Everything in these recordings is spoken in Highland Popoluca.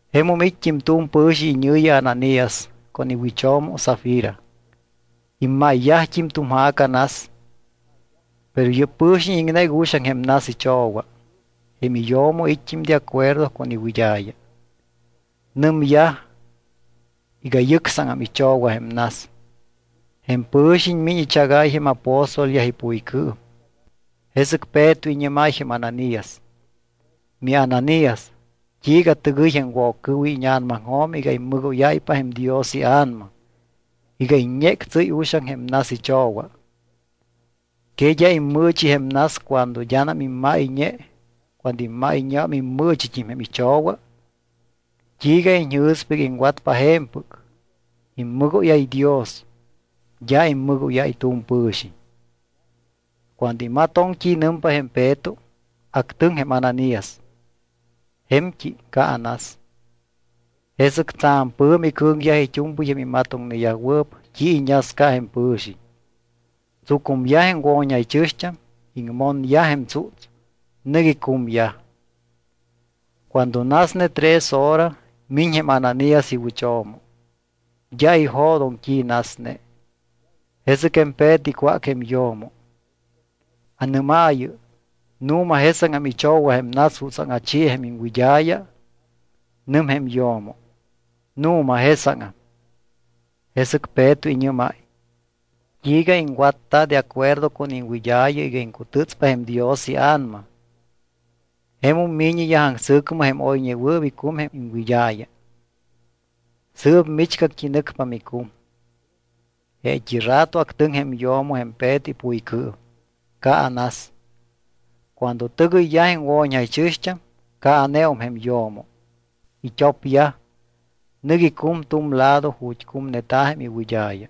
Jemum it́t́im tu̱m pɨ̱xiñ iñɨ̱yi Ananías con iwɨcho̱mo Safira. Imáyyajt́im tu̱m ja̱ca nas. Pero yɨ́p pɨ̱xiñ iŋnéc uxaŋ jém nas icho̱wa. Jém iyo̱mo it́t́im de acuerdo con iwɨd́a̱ya. Nɨmyaj iga yɨcsáŋam icho̱wa jém nas. Jém pɨ̱xiñ miñ ichagáy jém apóstolyaj ipuycɨɨm. Jesɨc Peto iñɨ́máy jém Ananías: —MiAnanías, ¿t́iiga tɨgɨy jém Woccɨɨwiñ íña̱namaŋjo̱m iga immɨgóyáypa jém Dios iA̱nama iga iññéctsɨ́y uxaŋ jém nas icho̱wa? ¿Que d́a immɨɨchi jém nas cuando d́anam immáyñe, cuando immáyñeum immɨɨchit́im jém icho̱wa? ¿T́iiga iñjɨ̱spa iga iŋwatpa je̱mpɨc? Immɨgóyáy Dios, d́a immɨgóyáy tu̱m pɨ̱xiñ. Cuando imatoŋ t́i nɨmpa jém Peto, actɨŋ jém Ananías, je̱mt́i caanas. Jesɨc tsa̱m pɨ̱mi cɨ̱ŋyaj it́u̱mpɨy jém imatoŋneyajwɨɨp t́i iñasca jém pɨ̱xiñ. Tsucumyaj jém wo̱ñjaychɨ̱xt́am, iŋmonyaj jém tsúts, nɨc icumyaj. Cuando nasne tres hora, miñ jém Ananías iwɨcho̱mo, d́a ijo̱doŋ t́i nasne. Jesɨc jém Peto icwác jém yo̱mo: —Anɨ́maayɨ, ¿nu̱ma jesáŋam icho̱wa jém nas jutsaŋ achi jém iŋwɨd́a̱ya? Nɨm jém yo̱mo: —Nu̱ma jesáŋam. Jesɨc Peto iñɨ́máy: —¿T́iiga iŋwatta de acuerdo con iŋwɨd́a̱ya iga iŋcutɨ́tspa jém Dios iA̱nama? Jemum mi̱ñiyaj aŋsɨ̱cmɨ jém oyñewɨɨp icum jém iŋwɨd́a̱ya. Sɨɨp michgact́i nɨcpa micum. Jeet́i rato actɨŋ jém yo̱mo jém Peto ipuycɨɨm. Caanas. Cuando tɨgɨyyaj jém wo̱ñjaychɨ̱xt́am caaneum jém yo̱mo. It́opyaj, nɨc icum tu̱m lado ju̱t́ cumneta̱ jém iwɨd́a̱ya.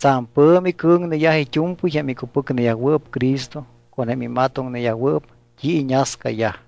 Tsa̱m pɨ̱mi cɨ̱ŋneyaj it́u̱mpɨy jém icupɨcneyajwɨɨp Cristo con jém imatoŋneyajwɨɨp t́i iñascayaj.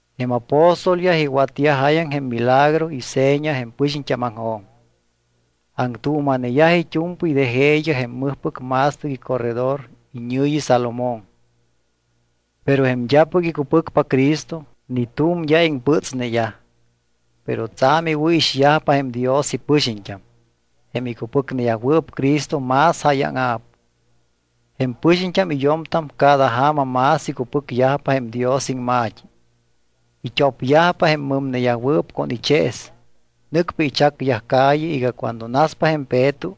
Jém apóstolyaj iwatyaj jáyaŋ jém milagro y seña jém pɨxiñt́ámaŋjo̱m. Aŋtuuma̱neyaj it́u̱mpɨy de jeeyaj jém mɨjpɨc ma̱stɨc icorredor iñɨ̱yi Salomón. Pero jém d́apɨc icupɨcpa Cristo ni t́u̱m d́a iŋpɨtsneyaj, pero tsa̱m iwɨ̱ixyajpa jém Dios ipɨxiñt́am. Jém icupɨcneyajwɨɨp Cristo más jáyaŋa̱p. Jém pɨxiñt́am y yo̱mtam cada ja̱ma más icupɨcyajpa jém Dios iŋma̱t́i. It́opyajpa jém mɨmneyajwɨɨp con ichees. Nɨcpa ichacyaj calle iga cuando naspa jém Peto,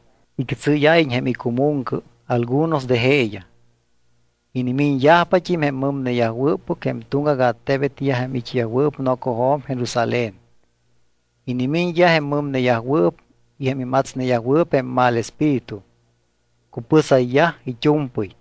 ictsɨ́yáyiñ jém icumuŋcɨ algunos de jeeyaj. Inimiñyajpat́im jém mɨmneyajwɨ́ppɨc jém tuŋgac attebetyaj jém it́yajwɨɨp nocojo̱m Jerusalén. Inimiñyaj jém mɨmneyajwɨɨp y jém imatsneyajwɨɨp jém mal espíritu. Cupɨsayyaj it́u̱mpɨy.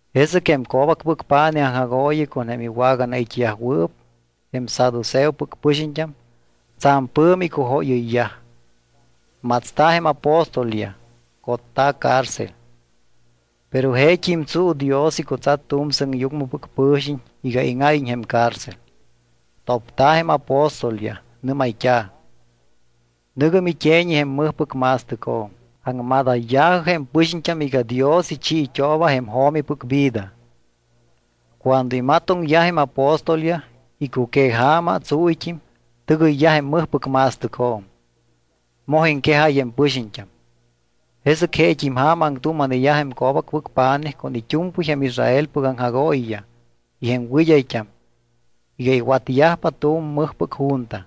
Jesɨc jém co̱bacpɨc pa̱nij aŋjagooyi con jém iwaganait́yajwɨɨp, jém saduceopɨc pɨxiñt́am, tsa̱m pɨ̱mi icujóyɨyyaj. Matsta̱ jém apóstolyaj, cotta̱ cárcel. Pero jeet́im tsuu Dios icutsat tu̱m sɨŋyucmɨpɨc pɨ̱xiñ iga íŋáyiñ jém cárcel. Topta̱ jém apóstolyaj. Nɨ́mayt́a̱: —Nɨ̱gɨ mite̱ñi jém mɨjpɨc ma̱stɨcjo̱m. Aŋmadayya̱jɨ jém pɨxiñt́am iga Dios ichiit́ooba jém jo̱mipɨc vida. Cuando imatoŋyaj jém apóstolyaj, icuqueja̱ma, tsúyt́im, tɨgɨyyaj jém mɨjpɨc ma̱stɨcjo̱m, moj iŋquejáy jém pɨxiñt́am. Jesɨc jeet́im ja̱ma aŋtuuma̱neyaj jém co̱bacpɨc pa̱nij con it́u̱mpɨy jém Israelpɨc aŋjagooyiyaj y jém wɨd́ayt́am iga iwatyajpa tu̱m mɨjpɨc junta.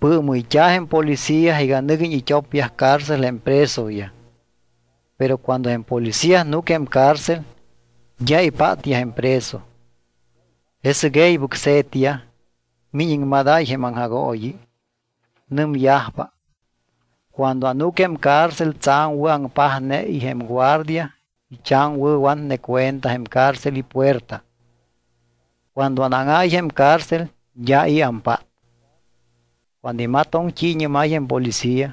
Pɨɨmɨyt́a̱ jém policía iga nɨguiñ it́opyaj cárcel jém presoyaj. Pero cuando jém policía núc jém cárcel, d́a ipátyaj jém preso. Jesɨc e̱ybɨc se̱tyaj. Miñ iŋmadáy jém aŋjagooyi. Nɨmyajpa: —Cuando anúc jém cárcel tsa̱m wɨ̱aŋpajne y jém guardia ichaŋwɨ̱watne cuenta jém cárcel ipuerta. Cuando anáŋáy jém cárcel d́a i̱ ampát. Cuando imatoŋ t́i iñɨ́máy jém policía,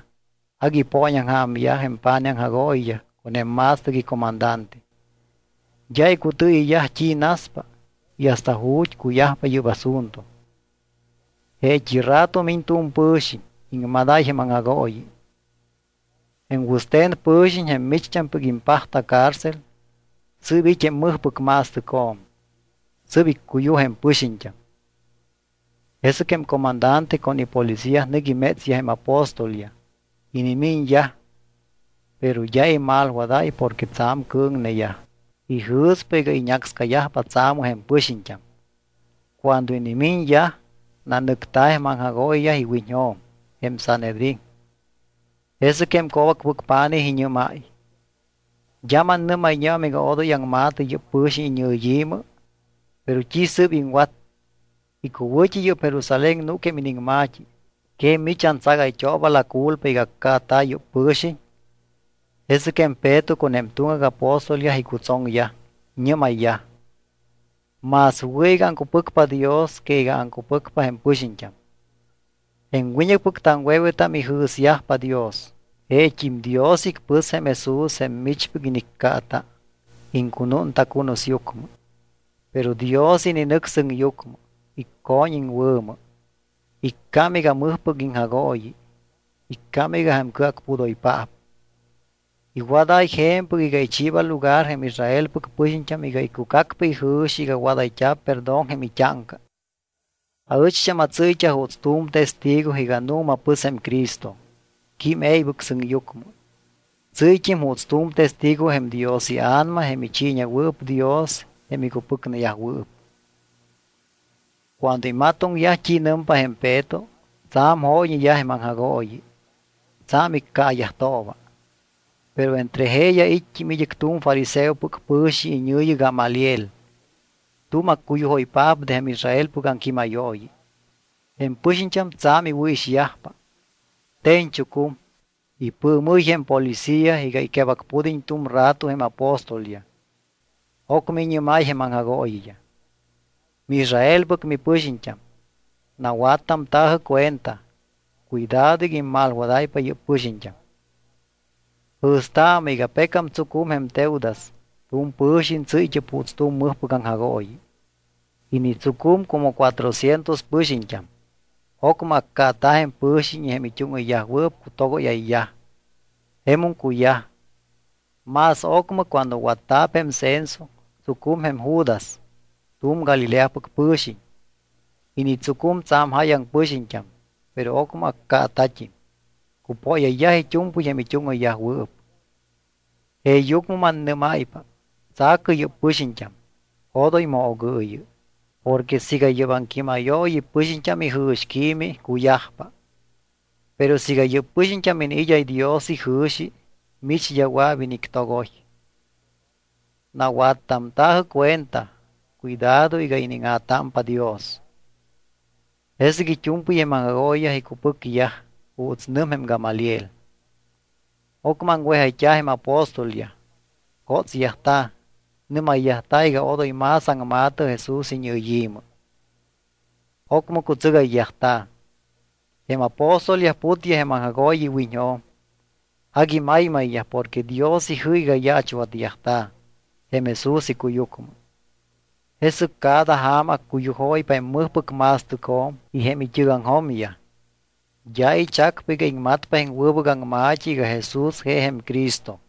agui ipooñaŋja̱myaj jém pa̱nij aŋjagooyiyaj con jém ma̱stɨc icomandante. D́a icutɨɨyɨyyaj t́i naspa y hasta ju̱t́ cuyajpa yɨ́p asunto. Jeet́i rato miñ tu̱m pɨ̱xiñ, iŋmadáy jém aŋjagooyi: —Jém wɨste̱n pɨ̱xiñ, jém micht́ampɨc impajta cárcel, sɨɨp it́ jém mɨjpɨc ma̱stɨcjo̱m. Sɨ́p iccuyuj jém pɨxiñt́am. Jesɨc jém comandante con ipolicía nɨc imétsyaj jém apóstolyaj. Inimiñyaj, pero d́a imalwadáy porque tsa̱m cɨ̱ŋneyaj. Ijɨ̱spa iga iñácscayajpa tsaamɨ jém pɨxiñt́am. Cuando inimiñyaj, nanɨcta̱ jém aŋjagooyiyaj iwiñjo̱m, jém Sanhedrín. Jesɨc jém co̱bacpɨc pa̱nij iñɨ́máy: —¿D́a mannɨ́mayñeum iga odoy aŋma̱tɨ yɨ́p pɨ̱xiñ iñɨyi̱mɨ? ¿Pero t́i sɨ́p iŋwat? Icuwɨ̱t́i yɨ́p Jerusalén núc jém iniŋma̱t́i. ¿Que mich antsagayt́ooba la culpa iga accaata̱ yɨ́p pɨ̱xiñ? Jesɨc jém Peto con jém tuŋgac apóstolyaj icutsoŋyaj. Iñɨ́mayyaj: —Más wɨ̱ iga aŋcupɨcpa Dios que iga aŋcupɨcpa jém pɨxiñt́am. Jém wiñɨcpɨc taŋwe̱wetam ijɨ̱syajpa Dios. Jeet́im Dios icpɨs jém Jesús jém michpɨc iniccaata, iŋcunúnta cunusyucmɨ. Pero Dios ininɨc sɨŋyucmɨ, icco̱ñ iŋwɨ̱mɨ. Iccám iga Mɨjpɨc iŋJagooyi, iccám iga jém Cɨacpudoypaap. Iwadáy je̱mpɨc iga ichiiba lugar jém Israelpɨc pɨxiñt́am iga icucacpa ijɨ̱xi iga wadayt́a̱p perdón jém it́áŋca. Aɨcht́am atsɨ́yt́a juuts tu̱m testigo iga nu̱ma pɨs jém Cristo, quím e̱ybɨc sɨŋyucmɨ. Tsɨ́yt́im juuts tu̱m testigo jém Dios iA̱nama jém ichiiñewɨɨp Dios jém icupɨcneyajwɨɨp. Cuando imatoŋyaj t́i nɨmpa jém Peto, tsa̱m jóyñeyaj jém aŋjagooyi. Tsa̱m iccaayajtooba. Pero entre jeeyaj it́t́im id́ɨc tu̱m fariseopɨc pɨ̱xiñ iñɨ̱yi Gamaliel. Tu̱m accuyujoypaap de jém Israelpɨc aŋquímayooyi. Jém pɨxiñt́am tsa̱m iwɨ̱ixyajpa. Te̱ñchucum, ipɨɨmɨ́y jém policía iga iquebacpud́iñ tu̱m rato jém apóstolyaj. Ocmɨ iñɨ́máy jém aŋjagooyiyaj: —MiIsraelpɨc mipɨxiñt́am, nawattamta̱jɨ cuenta. Cuidado iga immalwadáypa yɨ́p pɨxiñt́am. Jɨ̱staamɨ iga pecam tsucum jém Teudas, tu̱m pɨ̱xiñ tsɨ́yt́ɨp juuts tu̱m mɨjpɨc aŋjagooyi. Initsucum como cuatrocientos pɨxiñt́am. Ocmɨ accaata̱ jém pɨ̱xiñ y jém it́úŋɨyyajwɨɨp cutogóyayyaj. Jemum cuyaj. Más ocmɨ cuando watta̱p jém censo, tsucum jém Judas, tu̱m Galileapɨc pɨ̱xiñ. Initsucum tsa̱m jáyaŋ pɨxiñt́am. Pero ocmɨ accaata̱t́im. Cupóyayyaj it́u̱mpɨy jém it́úŋɨyyajwɨɨp. Jeeyucmɨ mannɨ́máypa, tsa̱cɨ yɨ́p pɨxiñt́am. Odoy moogɨɨyɨ. Porque siiga yɨ́p aŋquímayooyi pɨxiñt́am ijɨ̱xquiimi, cuyajpa. Pero siiga yɨ́p pɨxiñt́am iniid́áy Dios ijɨ̱xi, mich d́a wɨa̱p inictogoy. Nawattamta̱jɨ cuenta. Cuidado iga iníŋa̱támpa Dios. Jesɨc it́u̱mpɨy jém aŋjagooyiyaj icupɨcyaj juuts nɨm jém Gamaliel. Ocmɨ aŋwejayt́a̱ jém apóstolyaj, cótsyajta̱, nɨ́mayyajta̱ iga odoy más aŋma̱tɨ Jesús iñɨyi̱mɨ. Ocmɨ cutsɨgayyajta̱. Jém apóstolyaj putyaj jém aŋjagooyi iwiñjo̱m. Agui maymayyaj porque Dios ijɨ́c iga yaachwatyajta̱ jém Jesús icuyucmɨ. Jesɨc cada ja̱ma accuyujóypa jém mɨjpɨc ma̱stɨcjo̱m y jém it́ɨgaŋjo̱myaj. D́a ichacpa iga iŋmatpa jém wɨbɨc aŋma̱t́i iga Jesús je jém Cristo.